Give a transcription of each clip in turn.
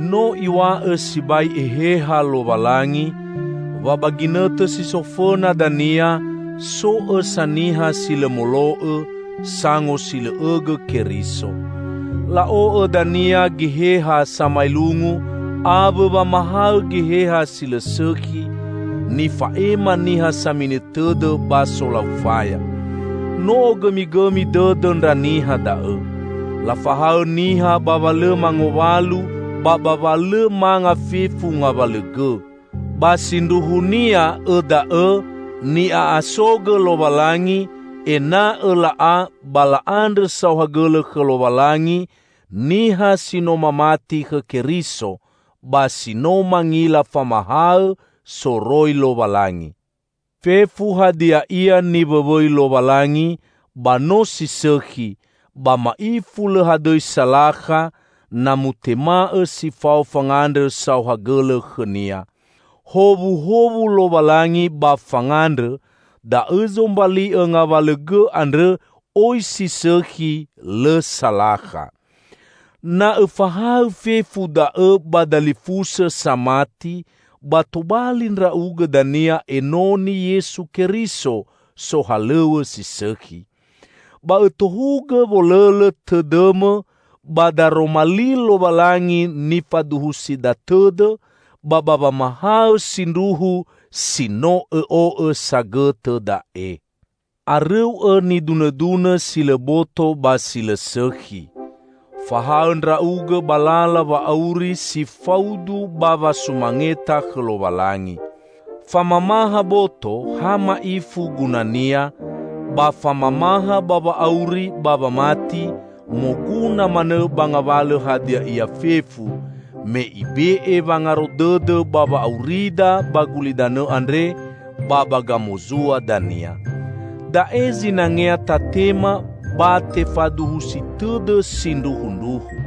No Iw̃a'õ sibai Eheha Lowalangi, wa ba ginõtõ si so fõna dania, so õsa niha si lõ molo'õ, sangosilõ'õgõ Keriso. La'o'õ dania geheha samaelungu awõ wamahaõ geheha si lõ sõkhi, nifa'ema niha samini tõdõ ba solau faya. No ogõmigõmi dõdõ ndra niha da'õ. Lafahaõ niha ba wa lõ mangowalu ba ba wa lõ manga fefu ngawalõ gõ. Ba sindruhunia õ da'õ ni'a'asogõ Lowalangi ena'õ la'a ba la'andrõ saohagõlõ khõ Lowalangi niha si no mamati khõ Keriso, ba si no mangila famahaõ soroi Lowalangi. Fefu hadia ia niwõwõi Lowalangi ba no si sõkhi, ba ma'ifu lõ hadõi salakha, na mutema'õ si fao fangandrõ saohagõlõ khõ-Nia. Howuhowu Lowalangi ba fangandrõ, da'õ zombali'õ ngawalõ gõ andrõ oi si sõkhi, lõ salakha. Na õfahaõ fefu da'õ ba dalifusõ samati, ba tobali ndra'ugõ dania enoni Yesu Keriso sohalõw̃õ si sõkhi. Ba õtohugõ wolõlõ tõdõmõ ba Daroma li Lowalangi nifaduhusida tõdõ, ba ba wamahaõ sindruhu si no õ'o'õ sagõtõ da'e. Arõu'õ nidunõdunõ si lõ boto ba si lõ sõkhi. Fahaõ ndra'ugõ ba lala wa'auri si faudu ba wasumangeta khõ Lowalangi. Famamaha boto, ha ma'ifu gunania, ba famamaha ba wa'auri ba wamati moguna manõ ba ngawalõ hadia ia fefu; me ibe'e wangaro dõdõ ba wa'aurida ba gulidanõ andre ba ba gamozua dania. Da'e zinangea tatema ba tefaduhusi tõdõ sindruhundruhu.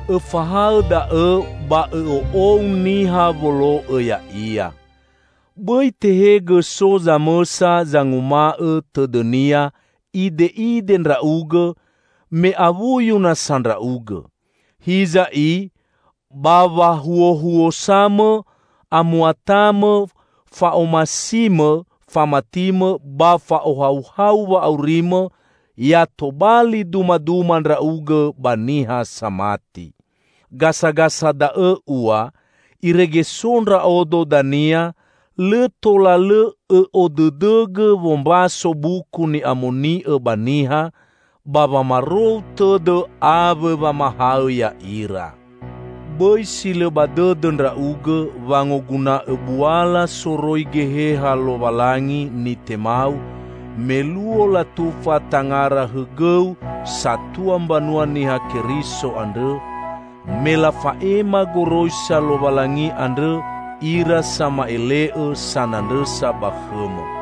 Õfahaõ da'õ ba õ'o'ou niha wolo'õ ya'ia. Bõi tehegõ so zamõsa zanguma'õ tõdõnia ide'ide ndra'ugõ, me awuyu nasa ndra'ugõ. Hiza i, ba wahuohuosamõ, amuatamõ, fa'omasimõ, famatimõ ba fa'ohauhau wa'aurimõ, ya tobali dumaduma ndra'ugõ ba niha samati. Gasagasa da'õ ua, irege so ndra'odo dania, lõ tola lõ õ'odõdõgõ wombaso Buku Ni'amoni'õ ba niha, ba wamarou tõdõ awõ wamahaõ ya'ira. Bõi si lõ ba dõdõ ndra'ugõ wangoguna'õ buala soroi Geheha Lowalangi nitemau me luo latufa tangara hõgõu satua mbanua Niha Keriso andrõ, me lafa'ema goroisa Lowalangi andrõ ira sama'ele'õ sanandrõsa ba khõmõ.